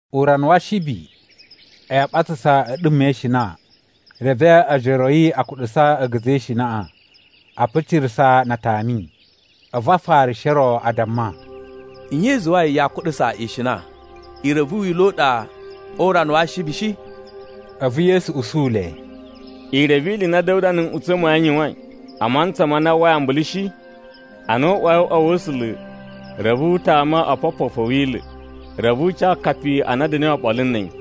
Urana wa Ashibi, a̱yi a ɓatsasa a̱ a̱ɗuma̱ e ishina, reve ojoro a̱ yi a kuɗusa a̱ga̱za̱ e ishinaꞌa, a picirasa na a tami. A̱vu Afarishi o ro a damma, “Nye i zuwai yaa kuɗusa ishina, i reve wila̱ u ɗa o urana wa Ashibi shi?” A̱vu Yesu usu le, “I reve ili i na Da̱wuda na̱ nꞌutsa̱ ma̱ yi n yuwain, a mantsa ma na a uwwai ambulu shi? Ana u uwai o uꞌwa wa̱ A̱sula̱, reve u tama opopofu a̱ Wila̱. Reve u ca akapi a na a̱ da̱na̱i oɓolo na̱ a̱yi,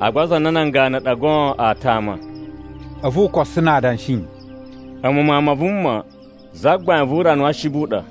agba aza a na nan ganu ɗa goon aa tama.” A̱vu u koso na adanshi, “A̱mu Mawun ma Vuma, Zagbain vu urana wa Ashibi u ɗa.”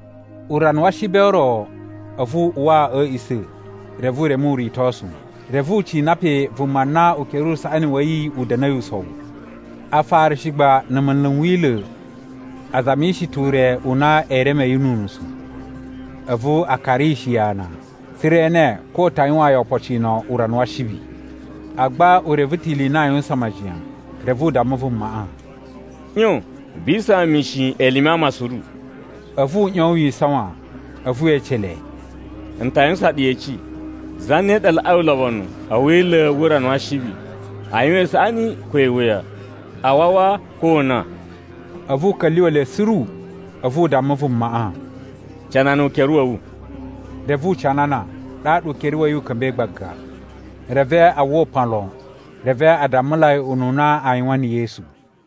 Urana wa Ashibi o ro, a̱vu u uwa a̱ a̱a̱ꞌisa̱, reve u reme uritosu. Reve u cina pe vuma na ukere u usaꞌani wa̱ yi u da̱na̱i usowu. Afarishi gba na̱ munlu n Wila̱ a zamishi ta̱ ure u na ee reme yi nu unusu. A̱vu a karishi yi ana, tsa̱ra̱ e ene ko u ta̱ yuwaan yi opocino urana wa Ashibi. Agba u reve ta̱ ili i na aa yuwusan majiyan, reve u damma vumaꞌa, “ꞌYon vi isawan mishin elime a ama suru.” A̱vu u ꞌyon wi isawan. A̱vu we ece le, “N ta yuwusan ɗu yeci. Zane ɗa laꞌai ulobonu a̱ Wila̱ wu urana wa Ashibi: a yuwan isaꞌani ko iwuya? A wawa ko o una?” A̱vu u ka̱lyuwa̱ le suru, a̱vu u damma vumaꞌa, “Canana ukere wa̱ wu.” Reve u canana, ɗaɗa ukere wa̱ yi u ka̱mba̱i gbaga. Reve a uwwa upan lo, reve a dammulai ununa aa yuwan na̱ Yesu.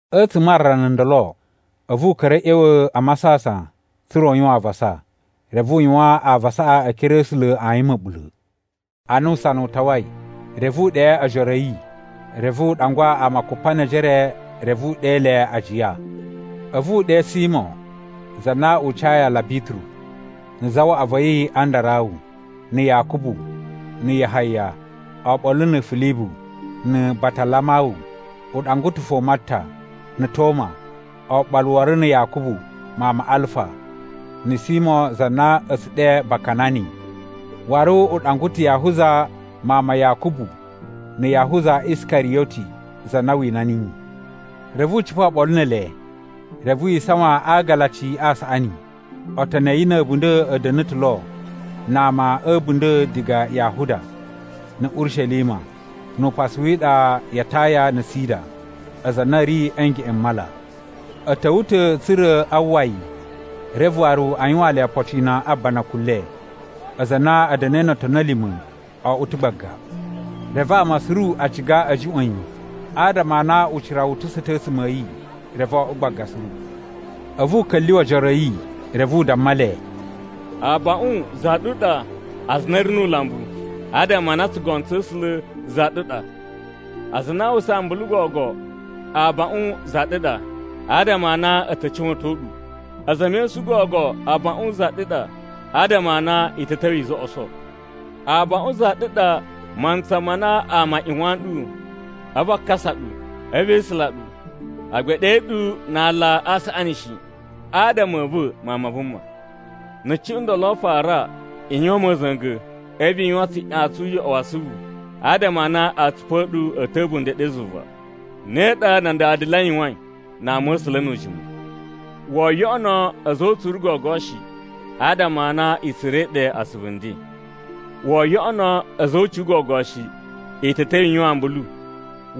A̱tsuma̱ a rana ndolo, a̱vu u ka̱ra̱ a̱ ꞌya̱wa̱ a masasan, tsa̱ra̱ u yuwan avasa. Reve u yuwan avasaꞌa e ekere a̱ A̱sula̱ ayin ma̱ɓula̱. Ana usana u tawai, reve u ɗe ojoro a̱ yi, reve u ɗangwa ama kupa ne ejere, reve u ɗe le ajiya. A̱vu u ɗe Simo (za na u cayi aala Bituru), na̱ zawaꞌa va̱ yi Andarawu, na̱ Yakubu, na̱ Yahaya, oɓolo na̱ Filibu, na̱ Batalamawu, u ɗangwa ta̱ fo Matta, na̱ Toma, oɓolo waru na̱ Yakubu mawun ma Alfa, na̱ Simo za na a̱ tsu ɗe Bakanani, waru u ɗangwa ta̱ Yahuza mawun ma Yakubu na̱ Yahuza Iskariyoti, za na wina niyi. Reve u cipa̱ oɓolo ne ele, reve wi isawan a agalaci a saꞌani. Otoni a̱ yi na̱ a̱bunda̱ a̱ da̱na̱ ta̱ lo na ama a̱ a̱bunda̱ diga Yahuda, na̱ Urishelima, nu upasu wi iɗa ya Taya na̱ Sida, aza a na a̱ ri a̱ ngeꞌen m mala. A̱ ta̱wa̱ ta̱ tsa̱ra̱ a uwwa yi, reve waru u yuwaan le opocino a banakun le. Aza a na a̱ da̱na̱i no otoni a̱ lima̱ o oꞌwo ta̱ gbaga. Reve ama suru a ciga a̱ juꞌwa̱n yi, adama a na ucira wu utusa̱ ta̱ a̱tsuma̱ a̱ yi, reve o oꞌwo gbaga suru. A̱vu u ka̱lyuwa̱ ojoro a̱ yi, reve u damma le, “Abaꞌun za ɗu ɗa aza a na a̱ ri nu ulambu, adama a na tsugono tsa̱ A̱sula̱ za ɗu ɗa. Aza a na a uwwusa ambulu gogo, abaꞌun za ɗu ɗa, adama a na a̱ ta̱ cuwa̱ton ɗu. A̱za̱ e mesun gogo abaꞌun za ɗu ɗa, adama a na i ta̱ ta̱wa̱ i zoꞌoso. Abaꞌun za ɗu ɗa mantsa ma na ama a ꞌyuwan ɗu, a̱vu a kasa ɗu, a̱vu e isula ɗu, agba ee ɗe ɗu na ala a saꞌani shi, adama a̱ va̱ Mawun ma Vuma. Na̱ cuꞌun ndolo fara, i yuwan ma̱za̱nga̱, a̱vu i yuwan tsuꞌyan tsu uyoꞌo wa asuvu, adama a na atsupu a̱ ɗu a̱ ta̱ a̱bunda̱ ɗe zuva. Ne ɗa nan dada le a yuwain na ama̱sula̱ nu ujimu. Woo yoꞌono a̱za̱ o utsuru gogo shi, adama a na i tsura̱i ɗe asuvu nden. Woo yoꞌono a̱za̱ o ucuwun gogo shi, i ta̱ ta̱wa̱ i yuwan ambulu.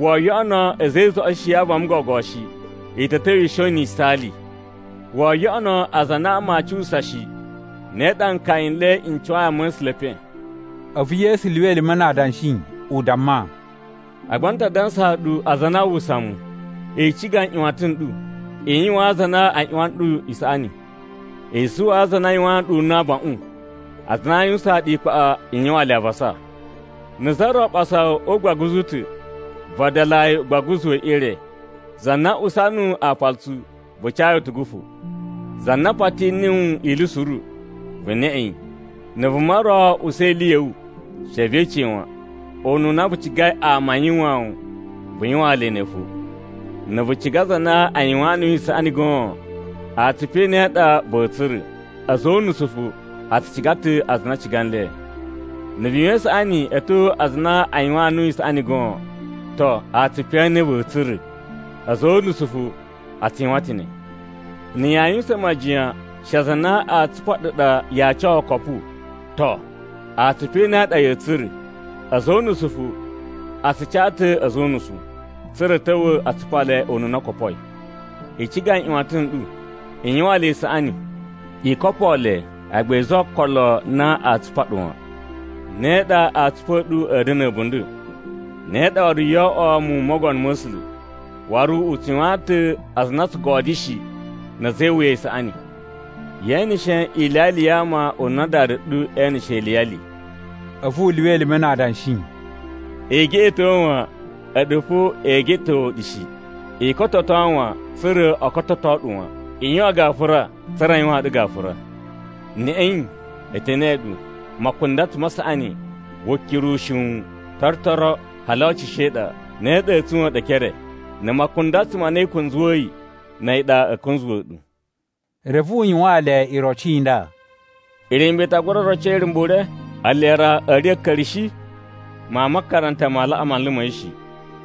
Woo yoꞌono a̱za̱ e izoꞌoshi ya avama gogo shi, i ta̱ ta̱wa̱ i shon na̱ yisaali. Woo yoꞌono aza a na ama aa cuwusa shi. Ne ɗa nkaya n le n cuwai ama̱sula̱ e epen.” A̱vu Yesu lyuwa elime na adanshi u damma, “Agba n ta dansaa ɗu aza a na aa uwwusa mu, i ciga nꞌyuwatan n ɗu, i yuwaan aza a na a ꞌyuwan ɗu isaꞌani. I zuwaa aza a na a yuwaan ɗu una̱ abaꞌun, aza a na a yuwusaan ɗu ikpaꞌa, i yuwaan le avasa. Na̱ za ro ɓasa wu o ugbaguzu u ta̱, vadalaa yi ugbaguzu we ire. Za na usa nuwu aapalutsu, vu ca yi utugu fo. Za na pati nuwu ili suru, vu neꞌe yi. Na̱ vuma ro usa ili ya̱ wu, she ve ece yi wan. Ununa vu cigai ama a yuwaan wu, vu yuwaan le ne fo. “Na̱ vu ciga aza a na a yuwaan nuwu isaꞌani goon, atsupu e ne a ɗa va̱a̱ tsura̱? A̱za̱ o unusu fo a tsu ciga ta̱ aza a na a ciga nle. Na̱ vu yuwan isaꞌani a̱ tyo aza a na a yuwaan nuwu isaꞌani goon, to, atsupu e ne a ɗa va̱a̱ tsura̱? A̱za̱ o unusu fo a tsu yuwan ta̱ ne. Na̱ yaa yuwusan majiyan she aza a na aa tsupa ɗu ɗa yaa ca okopu, to, atsupu e ne a ɗa ya̱a̱ tsura̱? A̱za̱ o unusu fo a tsu ca ta̱ a̱za̱ o unusu, tsa̱ra̱ a̱ ta̱wa̱ a tsupa le ununa o kopoi. I ciga nꞌyuwatan n ɗu, i yuwaan le isaꞌani. I kopoo le agba i zuwa okolo na aa tsupa ɗu wan. Ne ɗa atsupu a̱ ɗu a̱a̱ da̱na̱ a̱bunda̱. Ne ɗa waru yoo oꞌwo muwun m Mogono ma̱ A̱sula̱. Waru u tsu yuwaan ta̱ aza a na o tsu godyo shi, na̱ a̱za̱ e iwuya isaꞌani. Ye eneshe iliyali ya ama ununa Dada ɗu eneshe iliyali.” A̱vu u lyuwa elime na adanshi, “I geꞌeto wan, a̱ɗu fo ee geꞌetowa̱ ɗu shi. I kototo wan, tsa̱ra̱ o kototo ɗu wan. I yuwan gafura, tsa̱ra̱ a yuwaan ɗu gafura. Neꞌei, e te neꞌe ɗu: makundatsu ma saꞌani, wukiru ushiwun, torotoro, hali ocusho e iɗa. Ne ɗa a̱a̱ tsuwa̱n ɗu e ekere. Na̱ makundatsu ma na i kunzuwa̱yi, na̱ a̱yi ɗa a̱a̱ kunzuwa̱ ɗu.” Reve u yuwaan le iroci i nda: “Irumba̱ i ta gura roco irumba̱ ure? Ele ra a̱a̱ riya̱ a̱ a̱a̱ka̱ri shi? Mawun ma makaranta ma laꞌa manlu ma̱ yi shi,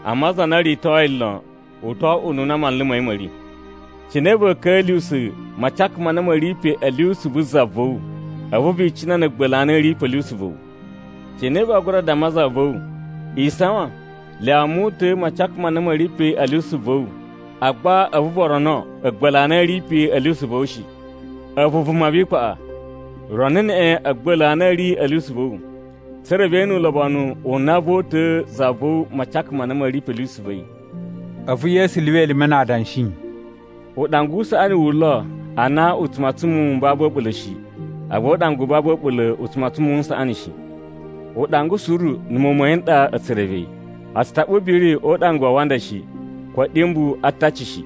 amma za na o ritoi lon, u to oꞌwo ununa manlu ma̱ yi ma̱ ri. “Cine va̱a̱ ka̱nla̱sa̱ macaka ma na ma̱ ri pe a̱ lyusu vu za va̱ wu, a̱vu vi icina na̱ a̱a̱gba̱la̱ a na a̱ ri pe a̱ lyusu va̱ wu? Cine vaa gura damma za va̱ wu, ‘Isawan, lyawa mu uta̱a̱ macaka ma na ma̱ ri pe a̱ lyusu va̱ wu,’ agba a̱vu vu rono a̱a̱gba̱la̱ a na a̱ ri pe a̱ lyusu va̱ wu shi? A̱vu vuma vi ikpaꞌa! Rono neꞌen a̱a̱gba̱la̱ a na a̱ ri a̱ lyusu va̱ wu, tsa̱ra̱ ve ene ulobonu u na voo uta̱a̱ za va̱ wu macaka ma na ma̱ ri a̱ lyusu va̱ yi.” A̱vu Yesu lyuwa elime na adanshi, “Uɗanga u saꞌani wu lo ana u tsu matsan muwun m babu a̱ɓula̱ shi, agba uɗanga u babu a̱ɓula̱ u tsu matsan muwun n saꞌani shi. Uɗanga suru na̱ muwun ma̱ yi n ɗa a̱ tsu reve yi. A tsu taɓa ubiri o uɗanga wa awanda shi, ko a̱ɗyumbu a ataci shi.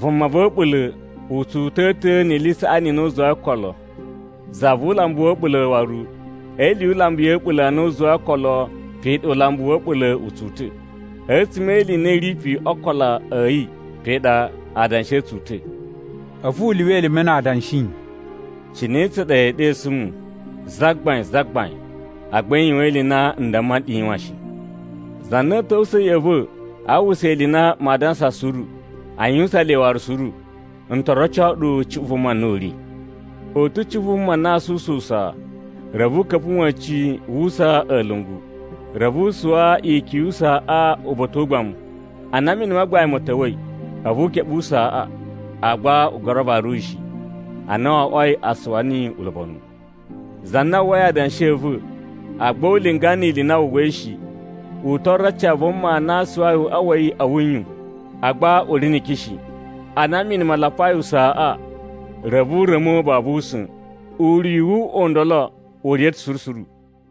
Vuma va̱ a̱ɓula̱ u tsu uta̱a̱ ta̱ ni ili i saꞌani i na u zuwai o ookolo, za vu ulambu wa̱ a̱ɓula̱ waru e ili yu ulambu ya̱ a̱ɓula̱ a na u zuwai o ookolo pe ɗa ulambu wa̱ a̱ɓula̱ u tsu uta̱. A̱tsuma̱ e ili i na i ri pe o ookolo a̱ yi pe ɗa adanshi a̱ tsu uta̱.” A̱vu u lyuwa elime na adanshi, “Cine tsa ɗa ya̱a̱ ɗesu mu, ‘Zagbain, Zagbain,’ agba i yuwan ili i na n damma nɗu i yuwan shi? Za na a̱a̱ ta̱wusa̱ ya̱ꞌa̱ va̱ aa uwwusa ili i na maa dansa suru, a yuwusan le waru suru, n to roco ɗu cuꞌun vuma na u ri. U ta̱ cuꞌun vuma na aa suwusa usaa, reve u ka̱pa̱ wa̱cin wu usaa a̱lungu, reve u suwa ikyun yu usaaꞌa uba̱ta̱ o ugbamu. Ana mini ma gbain ma̱ ta̱wa̱i, a̱vu u keɓe usaaꞌa, agba u gura varu yi shi. Ana wo oꞌwoi a suwa niyi ulobonu. Za na uwwai adanshi a̱ va̱, agba u linga ni ili i na wu uwwai shi, u to oroci a vuma na suwai uꞌwa wa̱ yi a̱ wuyun, agba u ri ni ikyun shi. Ana mini ma lapai usaaꞌa, reve u ra̱mo babu usa̱n. Uriyu wu uꞌwa u ndolo u riya̱ ta̱ suru suru.”